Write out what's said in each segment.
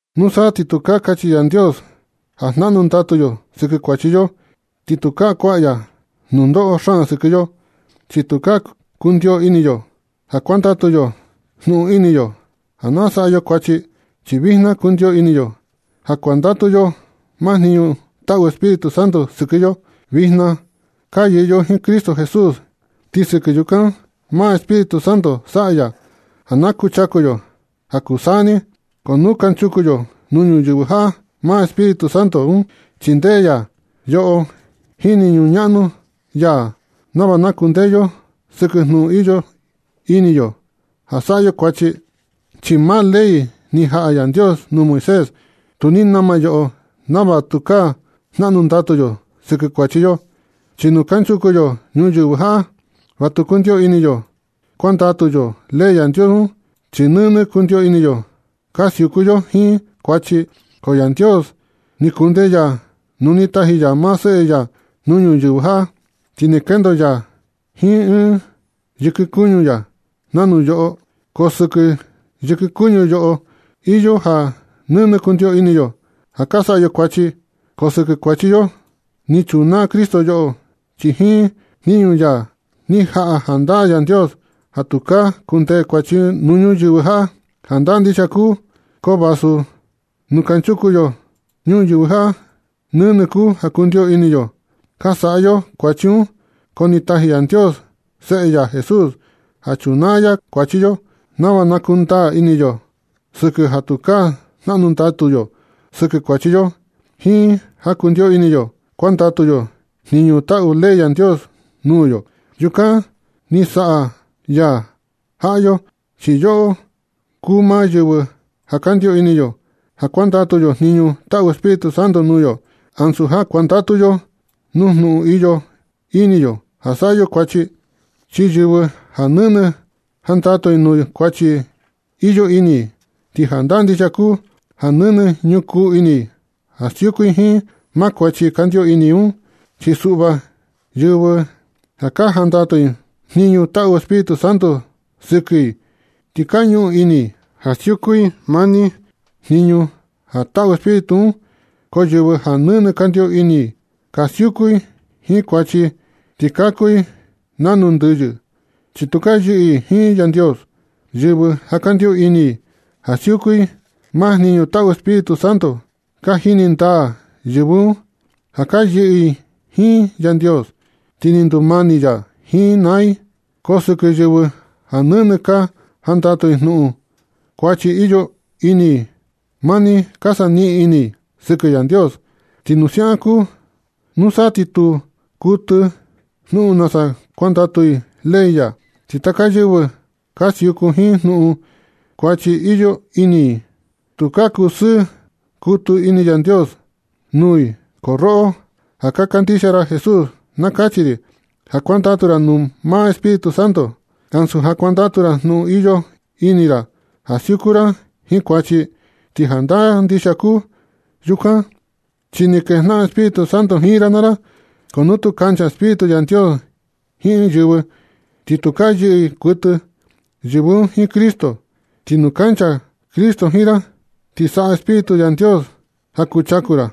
Nusa ti tukaa kachi Yandios ja jnaꞌnu ndatu yo sɨkɨ kuachi yo, ti tukaa kuaꞌa ya nunoꞌo xaan sɨkɨ yo. Chi tukaa kundio ini yo ja kuandatu yo jnuꞌun ini yo ja na saꞌa yo kuachi, chi vijna kundio ini yo ja kuandatu yo maa jniñu taꞌu Espíritu Santo sɨkɨ yo. Vijna ka yɨꞌɨ yo jiin Cristo Jesús, ti sɨkɨ yukan, maa Espíritu Santo saꞌa ya ja na kuchaku yo ja kuu taka saa ni. Ko nu kanchuku yo nuu ñuyɨvɨ jaꞌa, maa Espíritu un chindee ya yoꞌo jiin jniñu ñaꞌnu ya nava na kundee yo sɨkɨ jnuꞌun iyo ini yo ja saꞌa yo kuachi. Chi maa ley ni jaꞌa Yandios nuu Moisés, tu ni nama yoꞌo nava tukaa jnaꞌnu ndatu yo sɨkɨ kuachi yo. Chi nu kanchuku yo ñuyɨvɨ jaꞌa, va tu kundio ini yo kuandatu yo ley Yandios un, chi nɨnɨ kundio ini yo ka siuku yo jiin kuachi. Ko Yandios ni kundee ya nu ni taji ya maa Seꞌe ya nuu ñuyɨvɨ jaꞌa, ti ni kendo ya jiin ɨɨn yɨkɨ kuñu ya nanu yoꞌo. Ko sɨkɨ yɨkɨ kuñu yoꞌo, iyo ja nɨnɨ kundio ini yo ka saꞌa yo kuachi. Ko sɨkɨ kuachi yo un, ni chunaa Cristo yoꞌo, ti jiin jniñu ya un ni jaꞌa jandaa Yandios ja tukaa kundee kuachi nuu ñuyɨvɨ jaꞌa. Jandaa ndixia kuu un, ko vasu nu kanchuku yo ñuyɨvɨ jaꞌa nɨnɨ kuu ja kundio ini yo ka saꞌa yo kuachi un. Ko ni taji Yandios Seꞌe ya Jesús ja chunaa ya kuachi yo, nava na kundaa ini yo sɨkɨ ja tukaa jnaꞌnu ndatu yo sɨkɨ kuachi yo, jiin ja kundio ini yo kuandatu yo jniñu taꞌu ley Yandios nuu yo. Yukan ni saꞌa ya jaꞌa yo, chi yoꞌo kuu maa yɨvɨ ja kandio ini yo ja kuandatu yo jniñu taꞌu Espíritu Santo nuu yo, ansu ja kuandatu yo nu jnuꞌun iyo ini yo ja saꞌa yo kuachi. Chi yɨvɨ ja nɨnɨ jandatu i nuu kuachi iyo ini i, ti jandaa ndixia kuu ja nɨnɨ ñukuu ini i ja siuku i jiin maa kuachi kandio ini i un. Chi suꞌva, yɨvɨ ja ka jandatu i maa jniñu taꞌu Espíritu Santo sɨkɨ i, ti ka ñuꞌun ini i ja siuku i mani jniñu ja taꞌu Espíritu un. Ko yɨvɨ ja nɨnɨ kandio ini i ka siuku jiin kuachi ti ka kuu i nanu ndɨyɨ, chi tu ka yɨꞌɨ i jiin Yandios. Yɨvɨ ja kandio ini i ja siuku i maa jniñu taꞌu Espíritu Santo, ka jini ndaa yɨvɨ un ja ka yɨꞌɨ i jiin Yandios, ti ni ndumani ya jiin i naa i. Ko sɨkɨ yɨvɨ ja nɨnɨ ka jandatu i jnuꞌun kuachi iyo ini i, mani ka saniꞌin ini i sɨkɨ Yandios. Ti nu siaꞌan kuu, nusa ti tu kuɨtɨ jnuꞌun nasa kuandatu i ley ya. Ti taka yɨvɨ ja ka siuku jiin jnuꞌun kuachi iyo ini i un, tukaa kusɨɨ kutɨ ini Yandios nuu i. Ko roꞌo ja ka kandixia ra Jesús, na kachi ri ja kuandatu ra nu maa Espíritu Santo, ansu ja kuandatu ra jnuꞌun iyo ini ra ja siuku ra jiin kuachi. Ti jandaa ndixia kuu yukan, chi ni kejnaꞌan Espíritu Santo jiin ra naa ra. Ko nu tu kancha Espíritu Yandios jiin ɨɨn yɨvɨ, ti tu ka yɨꞌɨ kuɨtɨ yɨvɨ un jiin Cristo. Ti nu kancha Cristo jiin ra, ti saꞌa Espíritu Yandios ja kuchaku ra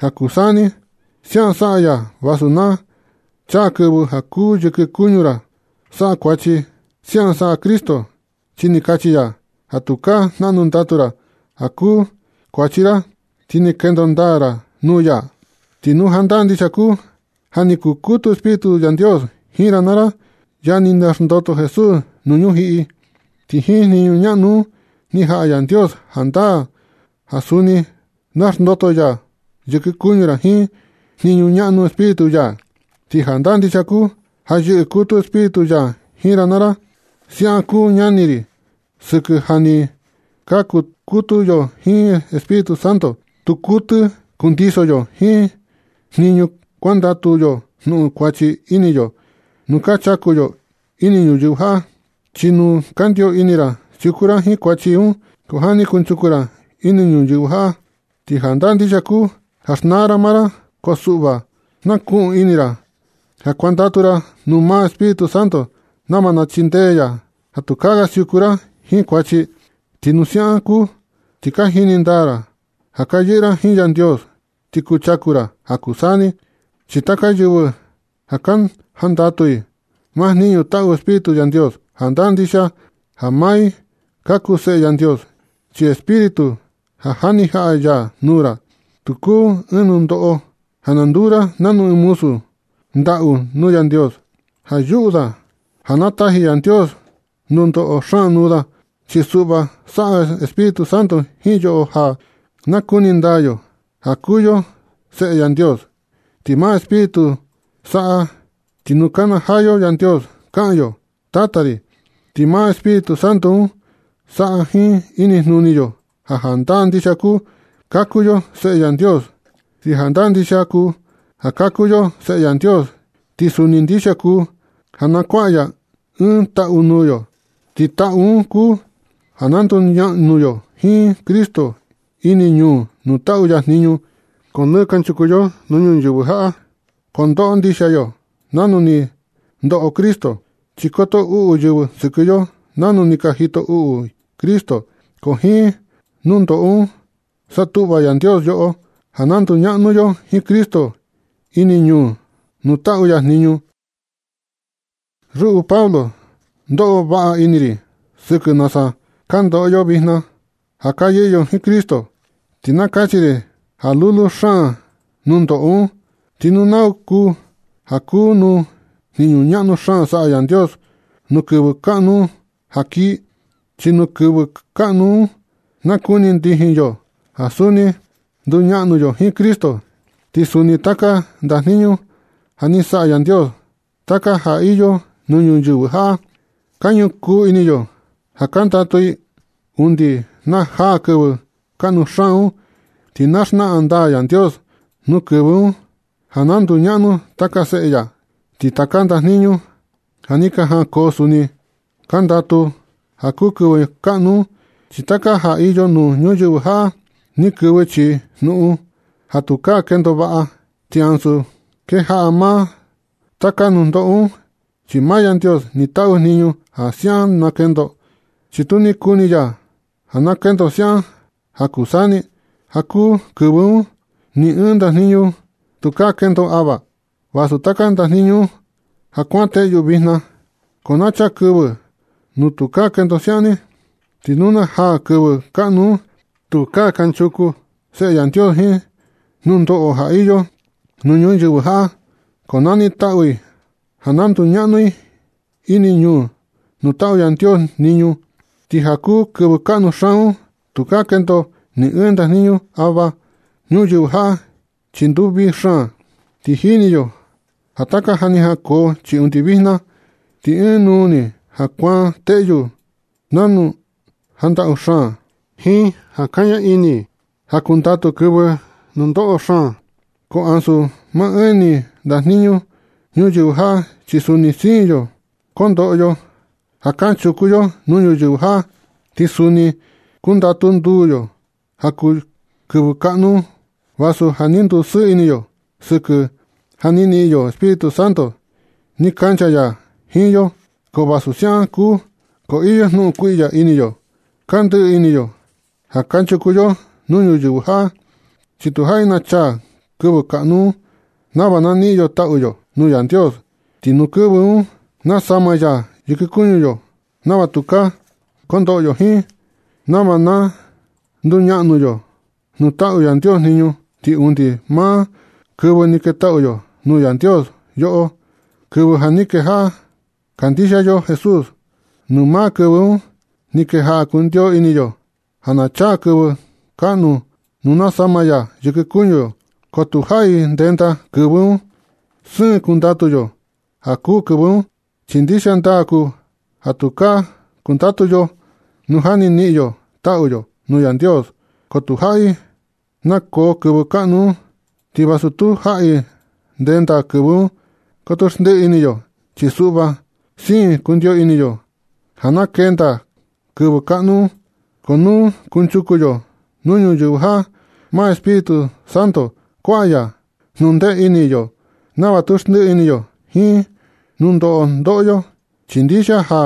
ja kuu taka saa ni. Siaꞌan saꞌa ya vasu na chaa kɨvɨ ja kuū yɨkɨ kuñu ra saꞌa kuachi. Siaꞌan saꞌa Cristo chi ni kachi ya ja tukaa jnaꞌnu ndatu ra ja kuu kuachi ra, ti ni kendo ndaa ra nuu ya. Ti nu jandaa ndixia kuu ja ni kukutu Espíritu Yandios jiin ra naa ra, ya ja ni xndoto Jesús nuu ñujiꞌi, ti jiin jniñu ñaꞌnu un, ni jaꞌa Yandios jandaa ja suni na xndoto ya yɨkɨ kuñu ra jiin jniñu ñaꞌnu Espíritu ya. Ti jandaa ndixia kuu ja yɨꞌɨ kutu Espíritu ya jiin ra naa ra. Siaꞌan kuu ñani ri, sɨkɨ ja ni ka kukutu yo jiin Espíritu Santo, tu kuɨtɨ kundiso yo jniñu kuandatu yo jnuꞌun kuachi ini yo nu ka chaku yo ini ñuyɨvɨ jaꞌa. Chi nu kandio ini ra siuku ra jiin kuachi un ja nɨ kanchuku ra ini ñuyɨvɨ jaꞌa, ti jandaa ndixia kuu ja xnaa ra maa ra. Ko suꞌva, na kuꞌun ini ra ja kuandatu ra nuu maa Espíritu Santo, nava na chindee ya ja tukaa ga siuku ra jiin kuachi. Ti nu siaꞌan kuu, ti ka jini ndaa ra ja ka yɨꞌɨ ra jiin Yandios ti kuchaku ra ja kuu saa ni. Chi taka yɨvɨ ja ka jandatu i maa jniñu taꞌu Espíritu Yandios, jandaa ndixia ja maa i ka kuu Seꞌe Yandios. Chi Espíritu ja ni jaꞌa ya nuu ra, tu kuu ɨɨn nundoꞌo ja na nduu ra nanu ɨɨn muzu ndaꞌu nuu Yandios, ja yuꞌu da ja na taji Yandios nunoꞌo xaan nuu da. Chi suꞌva, saꞌa Espíritu Santo jiin yoꞌo ja na kuni ndaa yo ja ka kuu yo Seꞌe Yandios. Ti maa Espíritu un saꞌa, ti nu kanajaa yo Yandios, kaꞌan yo: “Tata ri.” Ti maa Espíritu Santo un saꞌa jiin inijnuni yo ja jandaa ndixia ka kuu yo Seꞌe Yandios. Ti jandaa ndixia kuu ja ka kuu yo Seꞌe Yandios, ti suni ndixia kuu ja na kuaꞌa ya ɨɨn taꞌu nuu yo, ti taꞌu un kuu ja na nduñaꞌnu yo jiin Cristo ini ñuu nuu taꞌu ya jniñu. Ko nɨ kanchuku yo nuu ñuyɨvɨ jaꞌa, kondoꞌo ndixia yo nanu ni ndoꞌo Cristo, chi koto uꞌu yɨvɨ sɨkɨ yo nanu ni ka jito uꞌu i Cristo. Ko jiin nundoꞌo un satuꞌva Yandios yoꞌo ja na nduñaꞌnu yo jiin Cristo ini ñuu nuu taꞌu ya jniñu. Ruꞌu Pablo, ndoꞌo vaꞌa ini ri sɨkɨ nasa ka ndoꞌo yo vijna ja ka yɨꞌɨ yo jiin Cristo. Ti na kachi ri ja lulu xaan nundoꞌo un, ti tu nau ni kuu ja kuu nuu jniñu ñaꞌnu xaan saꞌa Yandios nuu kɨvɨ kaꞌnu ja kii. Chi nuu kɨvɨ kaꞌnu un na kuni ndijin yo ja suni nduñaꞌnu yo jiin Cristo. Ti suni taka ndajniñu ja ni saꞌa Yandios, taka ja iyo nuu ñuyɨvɨ jaꞌa, ka ñukuu ini i ja kandatu i undi na jaa kɨvɨ kaꞌnu xaan un. Ti na xnaꞌan ndaa Yandios nuu kɨvɨ un ja na nduñaꞌnu taka seꞌe ya. Ti taka ndajniñu ja ni jankoo suni kandatu ja kuu kɨvɨ kaꞌnu un, chi taka ja iyo nuu ñuyɨvɨ jaꞌa ni kɨvɨ chii jnuꞌun ja tukaa kendo vaꞌa. Ti ansu kejaꞌa maa taka nundoꞌo un, chi maa Yandios ni taꞌu jniñu ja siaꞌan na kendo. Chi tu ni kuni ya ja na kendo siaꞌan ja kuu saa ni. Ja kuu kɨvɨ un ni ɨɨn ndajniñu tukaa kendo ava, vasu taka ndajniñu ja kuan teꞌyu vijna. Ko na chaa kɨvɨ nu tukaa kendo siaꞌan ni, ti nu na jaa kɨvɨ kaꞌnu un, tukaa kanchuku Seꞌe Yandios jiin nundoꞌo ja iyo nuu ñuyɨvɨ jaꞌa. Ko nanitaꞌu i ja na nduñaꞌnu i ini ñuu nuu taꞌu Yandios jniñu. Ti ja kuu kɨvɨ kaꞌnu xaan un, tukaa kendo ni ɨɨn ndajniñu ava ñuyɨvɨ jaꞌa, chi nduu vii xaan. Ti jini yo ja taka ja ni jankoo, chi undi vijna, ti ɨɨn nuu ni ja kuan teꞌyu nanu ja ndaꞌu xaan, jiin ja kaña ini ja kundatu kɨvɨ nu ndoꞌo xaan. Ko ansu maa ɨɨn ni ndajniñu ñuyɨvɨ jaꞌa, chi suni siin yo kondoꞌo yo ja kanchuku yo nuu ñuyɨvɨ jaꞌa, ti suni kundatu nduu yo ja kuu kɨvɨ kaꞌnu un, vasu ja ni ndusɨɨ ini yo sɨkɨ ja ni niꞌin yo Espíritu Santo ni kancha ya jiin yo. Ko vasu siaꞌan kuu, ko iyo jnuꞌun kuiꞌya ini yo ka ndɨꞌɨ ini yo ja kanchuku yo nuu ñuyɨvɨ jaꞌa, chi tu jaꞌi na chaa kɨvɨ kaꞌnu un nava na niꞌin yo taꞌu yo nuu Yandios. Ti nuu kɨvɨ un na sama ya yɨkɨ kuñu yo nava tukaa kondoꞌo yo jiin, nava na nduñaꞌnu yo nuu taꞌu Yandios jniñu. Ti undi maa kɨvɨ ni ketaꞌu yo nuu Yandios yoꞌo, kɨvɨ ja ni kejaꞌa kandixia yo Jesús, nuu maa kɨvɨ un ni kejaꞌa kundio ini yo ja na chaa kɨvɨ kaꞌnu nuu na sama ya yɨkɨ kuñu yo. Ko tu jaꞌi ndenda kɨvɨ un. Siin kundatu yo ja kuu kɨvɨ un, chi ndixia ndaa kuu ja tukaa kundatu yo nu ja ni niꞌin yo taꞌu yo nuu Yandios. Ko tu jaꞌi na koo kɨvɨ kaꞌnu un. Ti vasu tu jaꞌi ndenda kɨvɨ un, koto xndiꞌi ini yo. Chi suꞌva siin kundio ini yo ja na kenda kɨvɨ kaꞌnu un. Ko nu kunchuku yo nuu ñuyɨvɨ jaꞌa, maa Espíritu Santo kuaꞌa ya jnundee ini yo nava tu xndiꞌi ini yo jiin nundoꞌo ndoꞌo yo. Ti ndixia ja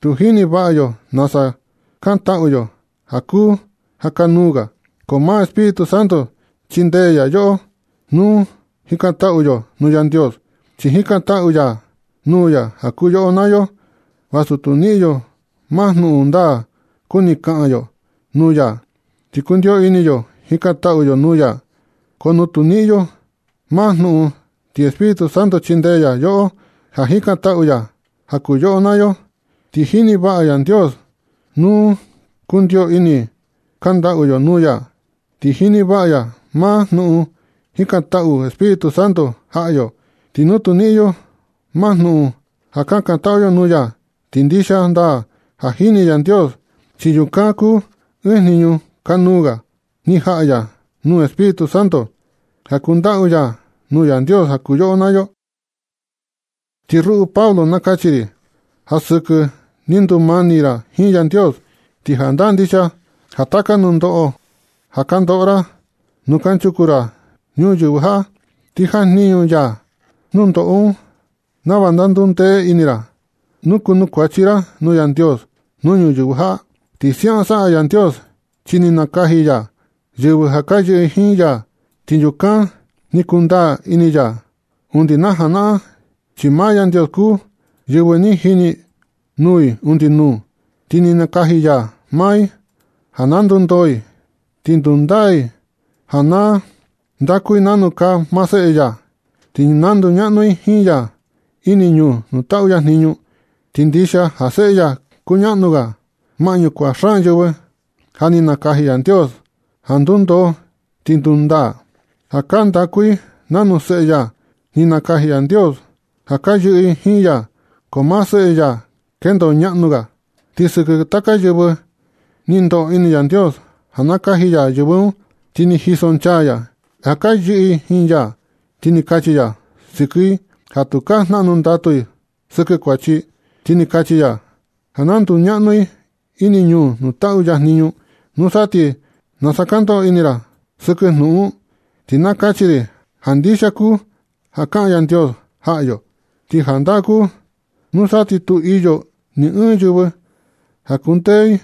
tu jini vaꞌa yo nasa kantaꞌu yo ja kuu ja kanuu ga. Ko maa Espíritu Santo chindee ya yoꞌo nu jikantaꞌu yo nuu Yandios, chi jikantaꞌu ya nuu ya ja kuu yoꞌo naa yo, vasu tu niꞌin yo maa jnuꞌun ndaa kuni kaꞌan yo nuu ya. Ti kundio ini yo jikantaꞌu yo nuu ya, ko nu tu niꞌin yo maa jnuꞌun, ti Espíritu Santo chindee ya yoꞌo ja jikantaꞌu ya ja kuu yoꞌo naa yo. Ti jini vaꞌa Yandios nu kundio ini kandaꞌu yo nuu ya, ti jini vaꞌa ya maa jnuꞌun jikantaꞌu Espíritu Santo jaꞌa yo nu tu niꞌin yo maa jnuꞌun ja kakantaꞌu yo nuu ya. Ti ndixia ndaa ja jini Yandios, chi yukan kuu ɨɨn jniñu kanuu ga ni jaꞌa ya nuu Espíritu Santo ja kandaꞌu ya nuu Yandios ja kuu yoꞌo naa yo. Ti ruꞌu Pablo na kachi ri ja sɨkɨ ni ndumani ra jiin Yandios, ti jandaa ndixia ja taka nundoꞌo ja ka ndoꞌo ra nu kanchuku ra ñuyɨvɨ jaꞌa, ti jajniñu ya nundoꞌo un nava na ndundee ini ra nu kunukuachi ra nuu Yandios nuu ñuyɨvɨ jaꞌa. Ti siaꞌan saꞌa Yandios chi ni nakaji ya yɨvɨ ja ka yɨꞌɨ i jiin ya, ti yukan ni kundaa ini ya undi na janaꞌan. Chi maa Yandios kuu yɨvɨ ni jini nuu i undi nuu, ti ni nakaji ya maa i ja na ndundoo i, ti ndundaa i ja na ndaku i nanu kaa maa Seꞌe ya, ti na nduñaꞌnu i jiin ya ini ñuu nuu taꞌu ya jniñu. Ti ndixia ja Seꞌe ya kuñaꞌnu ga maꞌñu kuaꞌa xaan yɨvɨ ja ni nakaji Yandios ja ndundoo ti ndundaa, ja ka ndaku i nanu Seꞌe ya. Ni nakaji Yandios ja ka yɨꞌɨ i jiin ya, ko maa Seꞌe ya kendo ñaꞌnu ga. Ti sɨkɨ taka yɨvɨ ni ndoꞌo ini Yandios ja nakaji ya yɨvɨ un, ti ni jisonchaa ya i ja ka yɨꞌɨ jiin ya, ti ni kachi ya sɨkɨ i ja tukaa jnaꞌnu ndatu i sɨkɨ kuachi, ti ni kachi ya ja na nduñaꞌnu i ini ñuu nuu taꞌu ya jniñu. ¿Nusa ti, nasa ka ndoꞌo ini ra sɨkɨ jnuꞌun un? Ti na kachi ri ja ndixia kuu ja kaꞌan Yandios jaꞌa yo. Ti jandaa kuu, nusa ti tu iyo ni ɨɨn yɨvɨ ka kundee i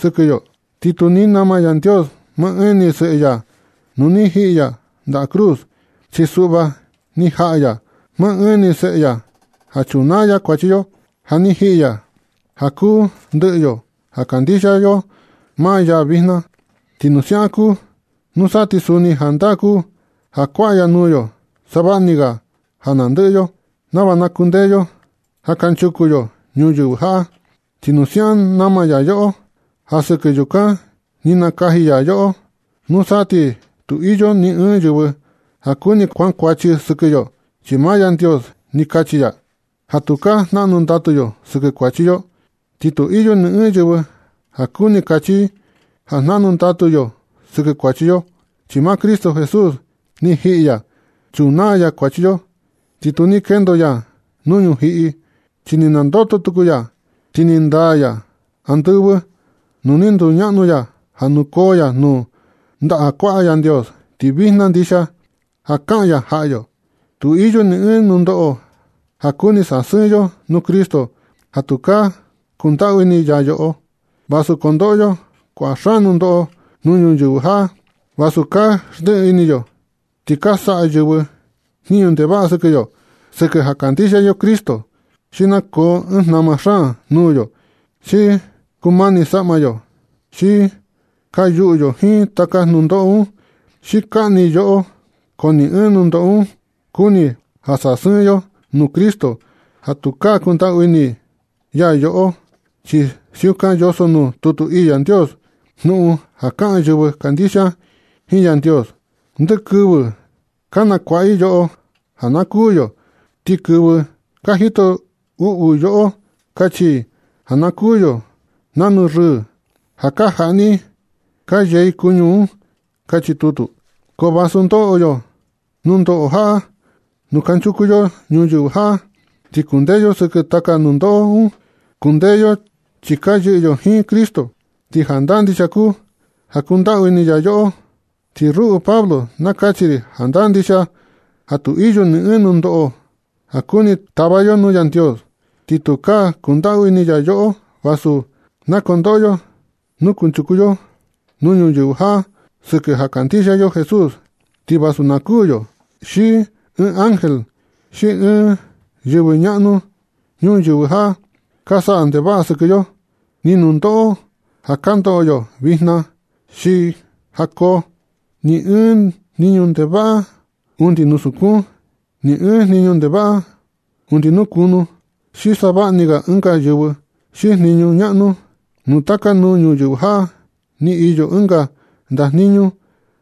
sɨkɨ yo. Ti tu ni nama Yandios maa ɨɨn ni Seꞌe ya nu ni jiꞌi ya ndaꞌa cruz. Chi suꞌva, ni jaꞌa ya maa ɨɨn ni seꞌe ya ja chunaa ya kuachi yo, ja ni jiꞌi ya ja kuu ndɨꞌɨ yo ja kandixia yo maa ya vijna. Ti nu siaꞌan kuu, nusa ti suni jandaa kuu ja kuaꞌa ya nuu yo savaꞌa ni ga ja nandɨꞌɨ yo nava na kundee yo ja kanchuku yo ñuyɨvɨ jaꞌa. Ti nu siaꞌan nama ya yoꞌo, ja sɨkɨ yukan ni nakaji ya yoꞌo, nusa ti tu iyo ni ɨɨn yɨvɨ ka kuni kankuachi sɨkɨ yo, chi maa Yandios ni kachi ya ja tukaa jnaꞌnu ndatu yo sɨkɨ kuachi yo. Ti tu iyo ni ɨɨn yɨvɨ ka kuni kachi i ja jnaꞌnu ndatu yo sɨkɨ kuachi yo, chi maa Cristo Jesús ni jiꞌi ya chunaa ya kuachi yo, ti tu ni kendo ya nuu ñujiꞌi, chi ni nandoto tuku ya, ti ni ndaa ya andɨvɨ nuu ni nduñaꞌnu ya ja nukoo ya nuu ndaꞌa kuaꞌa Yandios. Ti vijna ndixia ja kaꞌan ya jaꞌa yo. Tu iyo ni ɨɨn nundoꞌo ja kuni sasɨɨn yo nuu Cristo ja tukaa kundaꞌu ini ya yoꞌo. Vasu kondoꞌo yo kua xaan nundoꞌo nuu ñuyɨvɨ jaꞌa, vasu ka xndiꞌi ini yo ti ka saꞌa yɨvɨ jniñu ndevaꞌa sɨkɨ yo sɨkɨ ja kandixia yo Cristo, xi na koo ɨɨn jnama xaan nuu yo, xi kumani saꞌma yo, xi ka yuꞌu yo jiin taka nundoꞌo un, xi kaꞌni i yoꞌo, ko ni ɨɨn nundoꞌo un kuni ja sasɨɨn yo nuu Cristo ja tukaa kundaꞌu ini ya yoꞌo. Chi siukan yoso nuu tutu ii Yandios jnuꞌun ja kaꞌan yɨvɨ kandixia jiin Yandios: Ndɨ kɨvɨ ka nakuaꞌa i yoꞌo ja na kuū yo. Ti kɨvɨ ka jito uꞌu yoꞌo kachi i ja na kuū yo nanu rɨɨ ja ka jaꞌni i ka yee i kuñu un. Kachi tutu. Ko vasu ndoꞌo yo nundoꞌo jaꞌa nu kanchuku yo ñuyɨvɨ jaꞌa, ti kundee yo sɨkɨ taka nundoꞌo un. Kundee yo chi ka yɨꞌɨ yo jiin Cristo, ti jandaa ndixia kuu ja kuandaꞌu ini ya yoꞌo. Ti ruꞌu Pablo, na kachi ri jandaa ndixia ja tu iyo ni ɨɨn nundoꞌo ja kuni tava yo nuu Yandios ja tukaa kundaꞌu ini ya yoꞌo. Vasu na kondoꞌo yo nu kunchuku yo nuu ñuyɨvɨ jaꞌa sɨkɨ ja kandixia yo Jesús, ti vasu na kuū yo, xi ɨɨn ángel xi ɨɨn yɨvɨ ñaꞌnu ñuyɨvɨ jaꞌa ka saꞌa ndevaꞌa sɨkɨ yo, ni nundoꞌo ja ka ndoꞌo yo vijna xi ja koo, ni ɨɨn jniñu ndevaꞌa undi nuu sukun, ni ɨɨn jniñu ndevaꞌa undi nuu kunu, xi savaꞌa ni ga ɨnga yɨvɨ xi jniñu ñaꞌnu nuu taka nuu ñuyɨvɨ jaꞌa, ni iyo ɨnga ndajniñu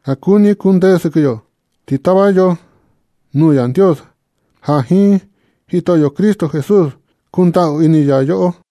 ja kuni kundee sɨkɨ yo. Ti tava yo nuu Yandios ja jiin Jitoꞌyo Cristo Jesús kundaꞌu ini ya yoꞌo.